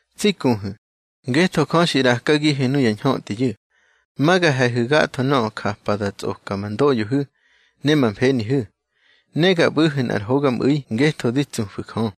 Tsi kuhu̱, ngetho Jö xi ꞌrakagihu̱ nuya ñhötꞌiyu̱, ma ga he̱hu̱ gatho nöꞌö japa da tsꞌoka ma ndoꞌyohu̱ ne ma mfenihu̱, ne ga ꞌbu̱hu̱ nꞌar hogamꞌu̱i ngetho di tsufu̱ Jö.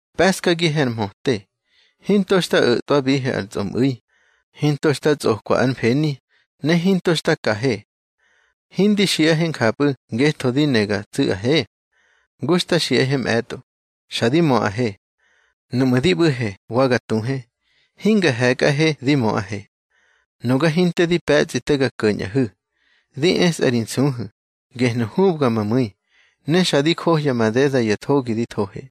Pe̱ꞌskagihe ar mhöte. Hinto xta o̱tꞌwabihe ar tsꞌomꞌu̱i, hinto xta tsꞌokwa ár mfeni, ne hinto xta kahe. Hindi xiꞌahe njapꞌu̱ ngetho di ne ga tsu̱ꞌahe. Ngu xta xiꞌahe mꞌe̱tꞌo, xa di möꞌahe. Nuꞌmu̱ di ꞌbu̱he wa ga tuhe, hinga he̱kꞌahe di möꞌahe. Nuga hinte di pe̱tsꞌi te ga ko̱ñꞌahu̱, di esꞌa ri nsuhu̱, gehnu̱ hubga ma mu̱i, ne xa di johya madeda ya thogi di thohe.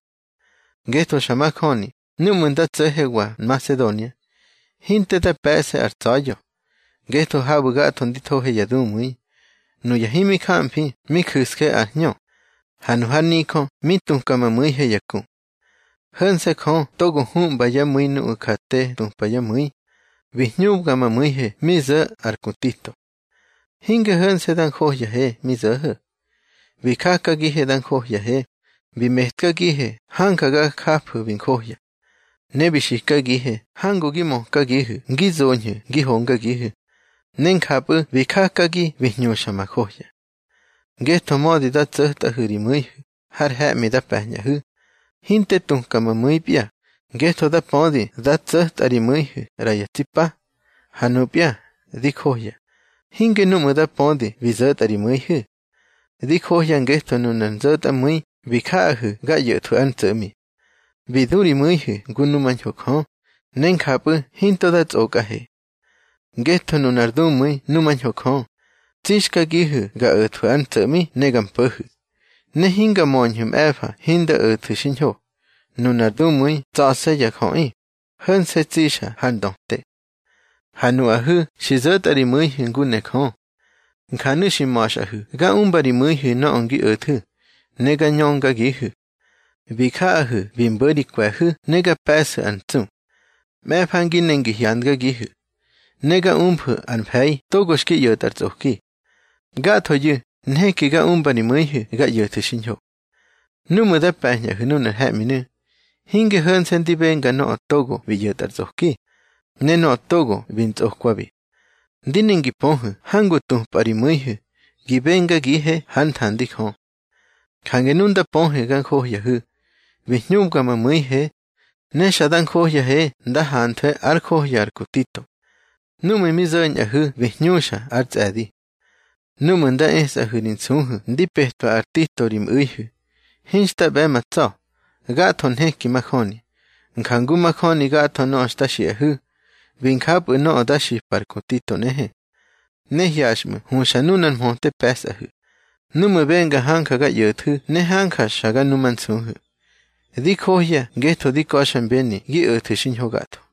Ngetho xa majöni núꞌmu̱ nda tso̱hewa Nmasedonia, hinte da pe̱ꞌse ar tsa̱ya̱, ngetho habu̱ gatho ndi thohe ya dumu̱i. Nuya himi jamfi mi ju̱sje ar hñö, ha nu har nijö mi tuka ma mu̱ihe ya ku. Ho̱nse̱ Jö togo huꞌmba yá mu̱i nuꞌu̱ ja te tupa yá mu̱i, bi hñubga ma mu̱ihe mi zo̱ ar ku Tito. Hinge ho̱nse̱ da njohyahe mi zo̱ho̱. Bi jakagihe da njohyahe, bi metkagihe hanja ga jafu̱ bi njohya. Ne bi xikagihe hangu gi mökagihu̱ ngi zoñhu̱ ngi hongagihu̱, ne njapꞌu̱ bi jakagi bi hñuxa ma johya. Ngetho mödi da tso̱tꞌahu̱ ri mu̱ihu̱ har he̱ꞌmi da pe̱ñꞌahu̱, hinte tuka ma mu̱ipya, ngetho da pödi da tso̱tꞌa ri mu̱ihu̱ ꞌra ya tsi pa. Ha nupya di johya, hinge núꞌmu̱ da pödi bi zo̱tꞌa ri mu̱ihu̱. Di johya ngetho nunar nzo̱tꞌamu̱i bi jaꞌahu̱ ga ꞌyo̱thwu̱ ár ntso̱ꞌmi. Bi du ri mu̱ihu̱ ngu numañho Jö, ne njapꞌu̱ hinto da tsꞌokꞌahe. Ngetho nunar dumu̱i numañho Jö, tsixkagihu̱ ga o̱thwu̱ ár ntso̱ꞌmi ne ga mpo̱hu̱, ne hinga möñhu̱ mꞌe̱fa hinda o̱thu̱ xiñho. Nunar dumu̱i tsa̱se̱ ya jöꞌi, ho̱nse̱ tsixa har ndöte. Ha nuꞌahu̱ xi zo̱tꞌa ri mu̱ihu̱ ngu ne Jö. Njanu̱ xi ma̱xꞌahu̱ ga umba ri mu̱ihu̱ nöꞌö ngi o̱thu̱, ne ga ñöngagihu̱. Bi jaꞌahu̱ bi mbo̱ ri kwe̱hu̱ ne ga pe̱ꞌsu̱ ar ntsu. Mꞌe̱fa ngi ne ngi hyandgagihu̱, ne ga umfu̱ ár mfe̱i togo xki ꞌyo̱tꞌa ar tsꞌoki. Gathoyu̱ nheki ga umba ri mu̱ihu̱ ga ꞌyo̱thu̱ xiñho. Núꞌmu̱ da pe̱ñꞌahu̱ nunar he̱ꞌminu̱, hinge ho̱nse̱ ndi benga nöꞌö togo bi ꞌyo̱tꞌa ar tsꞌoki, ne nöꞌö togo bi ntsꞌokwabi. Ndi ne ngi pöhu̱ hangu tupꞌa ri mu̱ihu̱ gi bengagihe hár nthandi Jö. Jange nu nda pöhe ga njohyahu̱, bi hñubga ma mu̱ihe. Ne xa da njohyahe nda hanthwe ár johya ar ku Tito. Núꞌmu̱ mi zo̱ñꞌahu̱ bi hñuxa ár tsꞌe̱di. Núꞌmu̱ nda esꞌahu̱ ri nsuhu̱ ndi petwa ar Tito ri mꞌu̱ihu̱, hinxta ꞌbe̱ ma tsa̱. Gatho nheki majöni, njangu majöni gatho nöꞌö xta xiꞌahu̱. Bi njapꞌu̱ nöꞌö da xipa ar ku Tito nꞌehe. Ne hyaxꞌmu̱ huxa nunar mhöte pe̱sꞌahu̱, núꞌmu̱ benga hanja ga ꞌyo̱ꞌthu̱ ne hanja xa ga numansuhu̱. Di johya ngetho di ka̱xmbeni gi o̱thu̱ xiñho gatho.